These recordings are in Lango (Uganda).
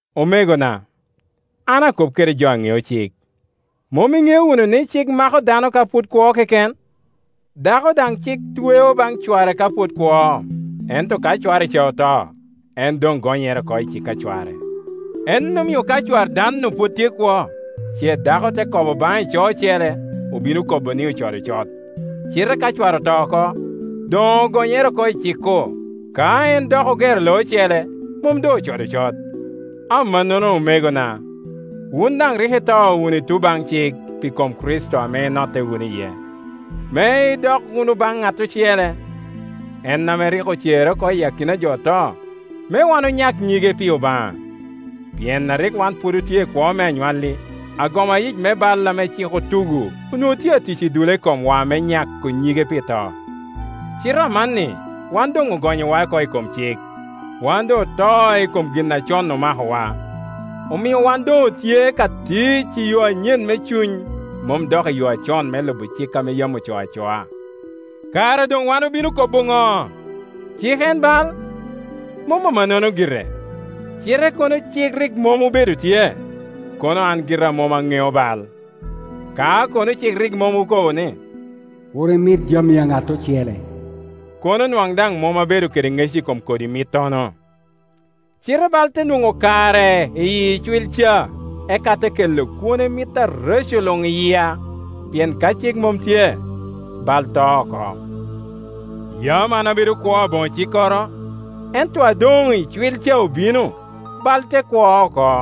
Omegona, an akop kede jo a ŋeo cik, mom iŋeo wunu ni, cik mako dano ka pwod kwo keken? Dako daŋ cik tweo baŋ cware ka pwod kwo; ento ka cware ca oto, en doŋ gonyere oko i cik a cware. En omio ka cwar dan-nu pwod tye kwo, ce dako te kobo baŋ ico ocele, obino kobo ni ocodo cot. Cite ka cware oto oko, doŋ ogonyere oko i cik-ku; ka en dok ogero lo ocele, mom doŋ ocodo cot. Amannono, omegona, wun daŋ rik ito wunu i tuŋ baŋ cik pi kom Kricito ame inotte wunu iye, me idok wunu baŋ ŋat ocele, en ame rik ocere oko iyi akina a jo oto, me waŋ onyak nyige pi Obaŋa. Pien a rik wan pwod otye i kwo me anywalli, agoma yic me bal ame cik otugo onwoŋo tye atic i dule komwa me nyako nyige pito. Cite amanni wan doŋ ogonyowa oko i kom cik, wan doŋ oto i kom gin a con omakowa. Omio wan doŋ otye ka tic i yo anyen me Cuny, mom dok i yo acon me lubo cik a yam ocoo acoa. Kara doŋ wan obino kobo ŋo? Cik en bal? Mom amannono gire! Cite kono cik rik mom obedo tye, kono an gira mom aŋeo bal. Ka kono cik rik mom okobo ni, “Kur imit jami a ŋat ocele,” kono nwaŋ daŋ mom abedo kede ŋec i kom kodi mittono. Cite bal te nwoŋo kare i icwil ca, eka te kela kwone mit areco luŋi yia. Pien ka cik mom tye, bal to oko. Yam an abedo kwo aboŋo cikkoro, ento a doŋicwil ca obino, bal te kwo oko,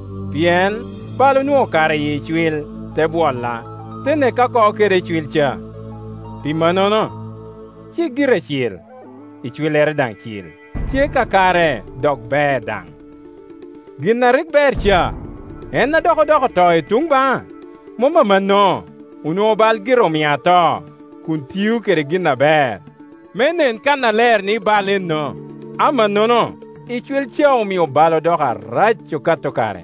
Pien bal onwoŋo kare i icwil, te bwola, te neka oko kede icwil ca. Pi mannono, cik gire cil, icwillere daŋ cil, tye kakare, dok ber daŋ. Gin a rik ber ca, en a dok odoko to i tun baŋa? Mom amanno! Onwoŋo bal gire omia ato, kun tio kede gin aber, me nen kannaler ni bal enno. Amannono icwil ca omio bal odoko arac okato kare.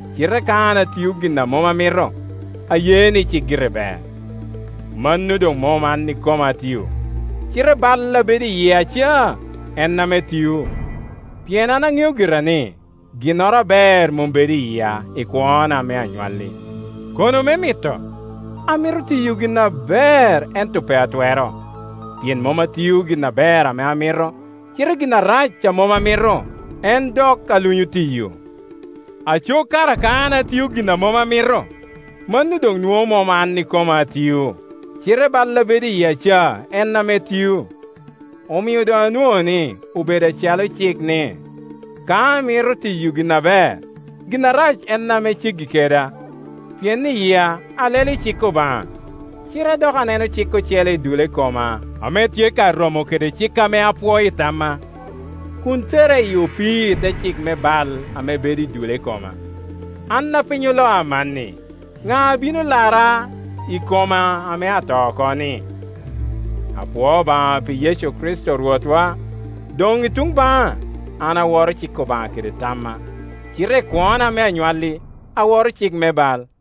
Cite ka an atio gin a mom amito, aye ni cik gire ber. Mano doŋ mom an ikoma atio, cite bal a bedo i yia ca, en ame tio. Pien an aŋeo gira ni, ginnoro aber mom bedo i yia, i kwona me anywalli. Kono me mito, amito tiyo gin aber, ento pe atwero; pien mom atio gin aber ame amito, cite gin arac a mom amito, en dok alunyo tiyo. Aco kara ka an atio gin a mom amito, mano doŋ nwoŋo mom an ikoma atio, cite bal a bedo i yia ca en ame tio. Omio doŋ anwoŋo ni obedo acalo cik ni, ka amito tiyo gin aber, gin arac en ame ceggi keda. Pien i yia alelo i cik Obaŋa, cite dok aneno cik ocele i dule koma ame tye ka romo kede cik ame apwoo i tamma, kun tera i opii i te cik me bal ame bedo i dule koma. An a piny oloa aman-ni, ŋa a bino lara i koma ame ata oko-ni? Apwoo Obaŋa pi Yecu Kricito Rwotwa! Doŋ i tun baŋa an aworo cik Obaŋa kede tamma, cite i kwona me anywalli aworo cik me bal.